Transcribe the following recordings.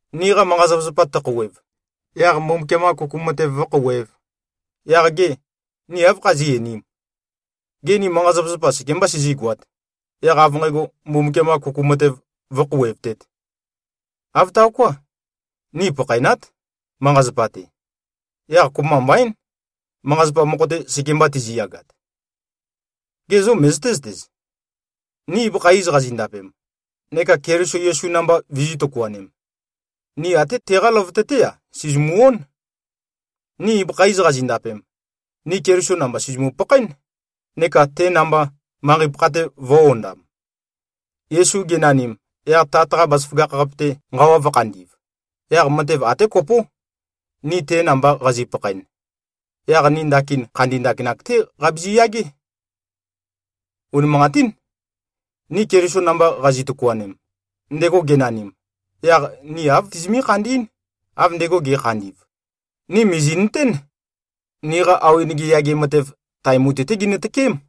Niqa manqa-zapazapa tøkhouwev, yaq Mbumbukiam-qa kuku matev vǿkhouwēv, yaq gê, ni áv khazí꞉-einīm? Gê, ni manqa-zapazapa sekemba sizígoāt, yaq av nqægo, Mbumbukiam-qa kuku matev vǿkhouwevtēt? Āv taoká. Ni pakhaenát, manqa-zapa-te. Yaq kopømba mbaín, manqa-zapa mokho-te sekemba tiziyagat. Gê, zo møzøté-zøtez? Ni ibøkha iz qazindapem, neka Keliso Yesu namba vizī꞉-tøkuanem, ni até teqá løvøte-té-a, sìzimu-ón. Ni ibøkha iz qazindapem, ni Keliso namba sìzimu-pakhaén, neka te namba, manqei-pakha-te vø̄-ondam. Yesu genanim, yaq Tat-qa bazaføgakh-qape-te nqawa vø̄khandi꞉v, yaq matev até kopó: Ni te namba qazi꞉-pakhaen, yaq ni ndakin khandi ndakinak-té qabizi-yagé. Unimanqatín! Ni Keliso namba qazi꞉-tøkuanem, ndego genanim, yaq ni āv tizimí-khandí꞉n, av ndego ge꞉khandi꞉v. Ni mìzi꞉nøtén, niqa awenege yage matev, tae mutui-té ginø-tøkém,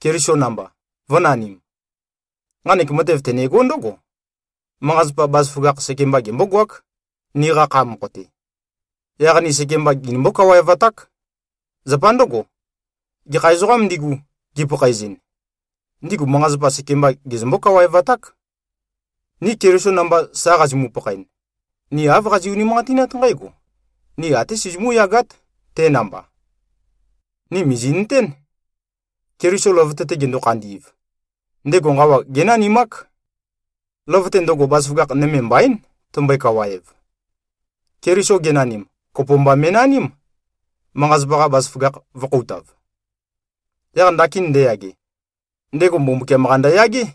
Keliso namba, vø̄nanim. Nqanek matev tønegó ndǿgo: Manqa-zapa, bazaføgakh sekemba gembógoák, niqa kha mokho-te. Yaq ni sekemba ginimbó-kawaevaták. Zapa ndǿgo, gekha ezoqām ndigu, gipakhaezɨn, ndigu manqa-zapa sekemba gezømbó-kawaevaták. Ni Keliso namba sa qazimu-pakhaen, ni āv qazi꞉-unimanqatinát nqǽgo: Ni até sizimú-yagát, te namba. Ni mìzi꞉nøtén, Keliso løvøte-te gendo-khandi꞉v, ndego nqawa génanimák. Løvøte ndøgo, bazaføgakh nøme mbaín, tømbøe-kawaev. Keliso genanim, kopo mba me꞉naním, manqa-zapa-qa bazaføgakh vø̄-khoutav. Yaq ndakin ndeyage, ndego Mbumbukiam-qa ndøyagé.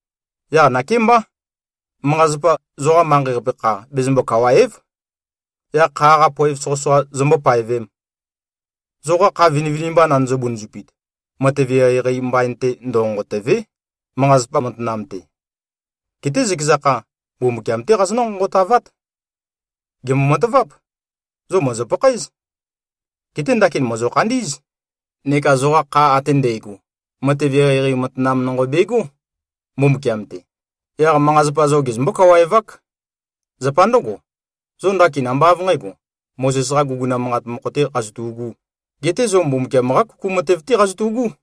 Yaq nakémbá, manqa-zapa zoqa manqei-qape kha bezømbo-kawàe᷄v, yaq kha-qa poev soqøsoqa zombó-paevēm. Zoqa kha vinivinimba nandøzø-bunuzupit, matev eqeieqei mbain-te ndønqonqotø̀ve᷄, manqa-zapa matanam-te. Geté zøkeza kha, Mbumbukiam-té qazonǿ-nqonqotavát. Gèmbo-mataváp! Zo mòzo-pakhaéz. Geté ndakin mòzo-khandí꞉z. Neka zoqa kha ate ndægo, matev eqeieqei matanam nonqo begó, Mbumbukiam-te. Yaq manqa-zapa zo gezømbó-kawaevák. Zapa ndǿgo, zo ndakin ambá av nqǣgo, Mozes-qa guguna manqat mokho-tē qazotu꞉gū. Geté zo Mbumbukiam-qá kuku matev-té qazotu꞉gú.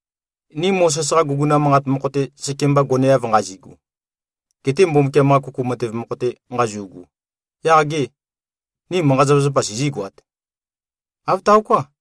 Ni Mozes-qa guguna manqat mokho-te sekemba goneav nqazigu, gete Mbumbukiam-qa kuku matev mokho-te nqazu꞉gu, yaq gê, ni manqa-zapazapa sizígoāt? Āv taoká!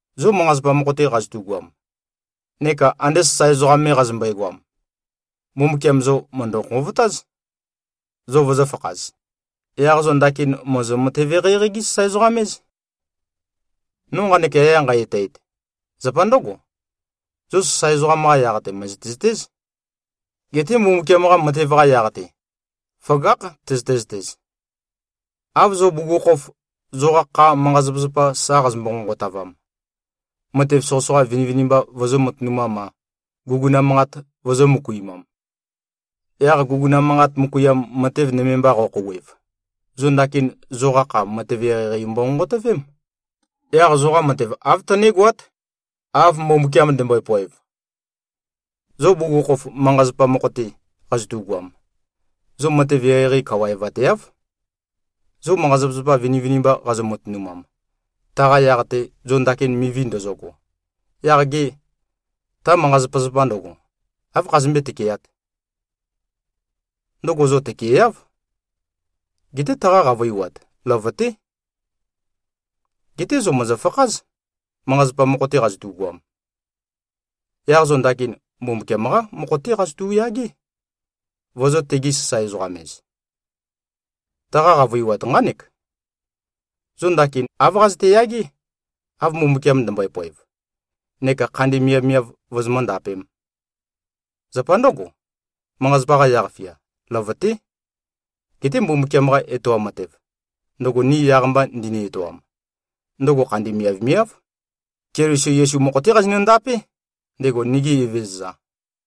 Zo manqa-zapa mokho-te qazotugoam neka ande sasae ezoqam me qazømbøe-goam, Mbumbukiam zo mø̀ndø-nqovotáz, zo vozōfakhaz. Yaq zo ndakin mòzo-matev-eqeieqei-gí-sasae-ezoqam-éz. No nqanek yaya nqæ-etæet, zapa ndǿgo: Zo sasae ezoqam-qa yaq-te, mø̀zøte-zøtéz. Geté Mbumbukiam-qa matev-qa yaq-te, føgákh tøzøte-zøtez. Av zo bugukhokhof, zoqa kha manqa-zapazapa sa qazombo-nqonqotavam, matev soqøsoqa vinivinimba vozō-matønumam-a, guguna manqat vozō-møkuimam, yaq guguna manqat møkuiam matev nøme mba qo꞉khouwev, zo ndakin zoqa kha matev eqeieqei mbonqonqotøvém. Yaq zoqa matev āv tønégoát, av Mbumbukiam ndømbøe-poev. Zo bugukhokhof manqa-zapa mokho-te qazotugoam, zo matev eqeieqei kawaevateáv. Zo manqa-zapazapa vinivinimba qazo-matønumam, taqa yaq-te zo ndakin mivi ndozogo, yaq gê, ta manqa-zapazapa ndøgo, áv khazømbé-tøkeat? Ndøgo zo tøkeeáv. Geté taqa qavøiwat, løvøté. Geté zo mòzofakház, manqa-zapa mokho-te qazotugoam. Yaq zo ndakin, Mbumbukiam-qá mokho-té qazotu꞉-yagé, vozō-tegi-sasae-ezoqam-ez. Taqa qavøiwat nqánek: Zo ndakin āv qazøte-yagé, av Mbumbukiam ndømbøe-poev, neka khandi miavmiav vozomǿ-ndapēm. Zapa ndǿgo, manqa-zapa-qa yaq-fia, løvøté. Geté Mbumbukiam-qa etoam matev, ndøgo ni yaq-mba ndini-etoam, ndøgo khandi miavmiáv. Keliso Yesu mokho-té qazindapé, ndego nigi Evezøza.